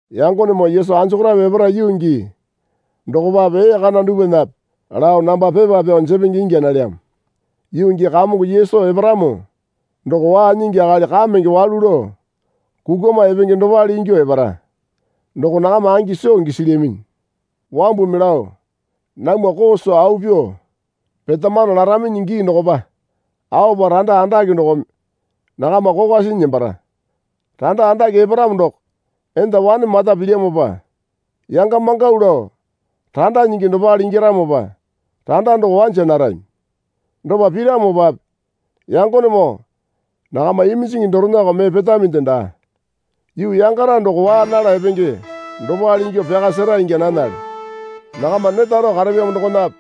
Yangonemoo Yesu anjokorape epara yuu gii dokopape ee kana dupwanape lao namba pepa pyao jepenge ingya nalyamo. Yuu gii Kamongo Yesu eparamo doko waa nyingi akali kamenge walu lao kukwama epenge dopale ingyuo epara doko nakama angi soo gisilyaminyi. Wambumi lao, Namwa koo soo au pyuo petamano laraminyi gii dokopa aopa randa andake dokome nakama kokwa sinyi nembara. Randa andake eparamo doko enda wane mata pilyamopa yanga mangau lao randa nyingi dopale ingyaramopa randa doko wanja narami. Dopa piramopape yangonemoo nakama iminjingi dorenako mee petaminde daa. Yuu yangara doko waa nala epenge dopale ingyuo pyaka sera ingya nanale. Nakama neta rao karapyamo dokonape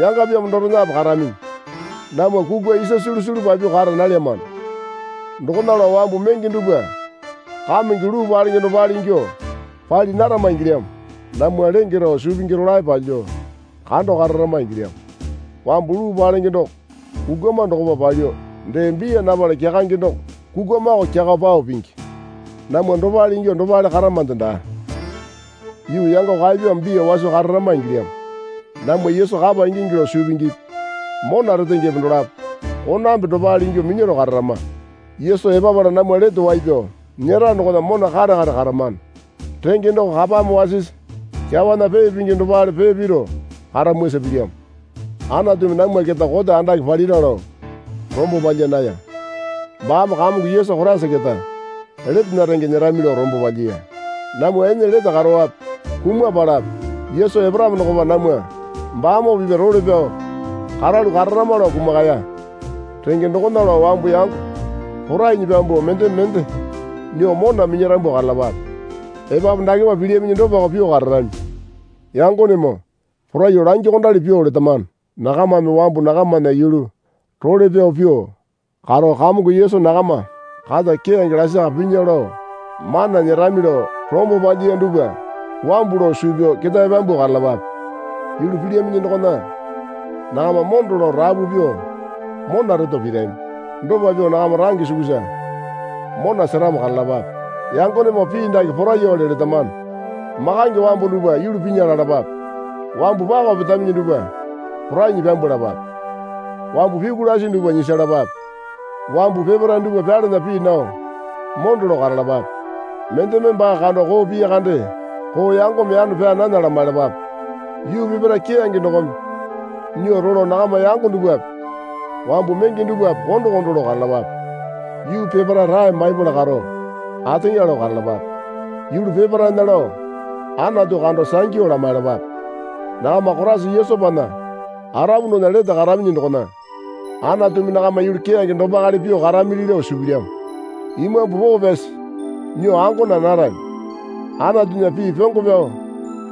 yangapyamo dorenape karaminyi. Namwa kukwa isa sulu sulu papyuo kara nalyamano. Dokona lao wambu menge dupwa kamenge luu palenge dopale ingyuo pali narama ingilyamo. Namwa lenge rao suu pingi rolae palyuo kando kararama ingilyamo. Wambu luu palenge doko kukwama dokopa palyuo dee biya napala kyakange doko kukwamako kyakao pao pingi. Namwa dopale ingyuo dopale karamande daa. Yuu yango kaepyamo biya waso kararama ingilyamo. Namwa Yesu kapa ingingi lao suu pingipi mona retengepe dolapo konambe dopale ingyuo minyaro kararama. Yesu epapala namwa lete wai pyao nyera dokona mona kare kare karamano renge doko kapame wasisi kyawana pee pingi dopale pee piru karamwasa pilyamo. Anatumi namwa keta kote andake palira lao rombo palya naya. Baame Kamongo Yesu Koraisa keta letena renge nyerami lao rombo palyiya. Namwa ene lete karowape kumapalape Yesu eparamo dokopa namwa baamoo pipya role pyao karalu kararama lao kumakaya. Renge dokona lao wambu yango porainyi pyambuo mendeme mende nyuo mona minyarambu karalapape. Epapu dakepa pilyaminyi dopako pyuo kararami. Yangonemoo poraiyuo langyuokondali pyuo letamano. Nakamame wambu nakamana yulu role pyao pyuo karo Kamongo Yesu nakama kata keyange lasaka pinya lao mana nyerami lao rombo palyiya dupwa wambu lao suu pyao ketae pyambuo karalapape. Yulu pilyaminyi dokona nakama mondo lao rapu pyuo mona reto pirami. Dopa pyuo nakama range sukusa mona seramo karalapape. Yangonemoo pii dake poraiyawale letamano. Makange wambu dupwa yulu pinya lalapape. Wambu pako petaminyi dupwa porainyi pyambwalapape. Wambu pyuku lasi dupwa nyisalapape. Wambu peparae dupwa pyalana pii nao mondo lao karalapape. Mendeme baa kando koo piya kande koo yangome yano pyaa nana lamailapape. Yuu peparae keyange dokome nyuo rolo nakama yango dupwape wambu menge dupwape kondo kondo lao karalapape. Yuu peparae rae maipala karo ateŋa lao karalapape. Yulu peparaena lao Anatu kando sangyu lamaiyalapape. Nakama Koraisa Yesupana arapu dokona lete karaminyi dokona Anatumi nakama yulu keyange dopakale pyuo karamili lao suu pilyamo. Imambu Poo Pyasi nyuo ango naa narami. Anatunya pii pyongo pyao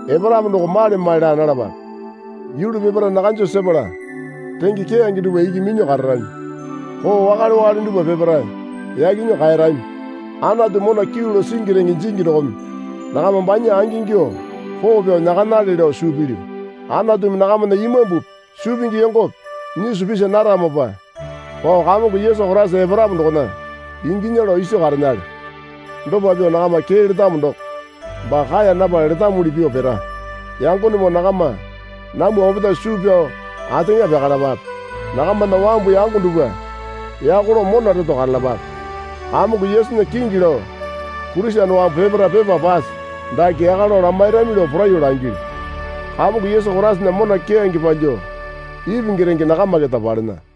eparamo doko male male laa nalapape. Yulu peparae nakanjo sepala renge keyange dupwa iki minyuo kararami. Koo wakale wakale dupwa peparae yaki nyuo kaerami. Anatu mona kyuu lao singi renge jingi dokome nakama banya angingyuo poo pyao nyakanale lao suu pilyu. Anatumi nakamana imambupi suu pingi yongope nyisu pisi naramopa pao Kamongo Yesu Koraisa eparamo dokona inginya lao iso karenale. Dopa pyuo nakama kee letamo doko baa kaeya napala letamuli pyuo pira. Yangonemoo nakama namwa opetae suu pyao ateŋa pyakalapape. Nakamana wambu yango dupwa yako lao mona reto karalapape. Kamongo Yesunya kingi lao Kurisene wambu peparae pepa pase dake yaka lao lamairami lao poraiyuo langilyu. Kamongo Yesu Koraisana mona keyange palyuo ipingi renge nakama keta palena.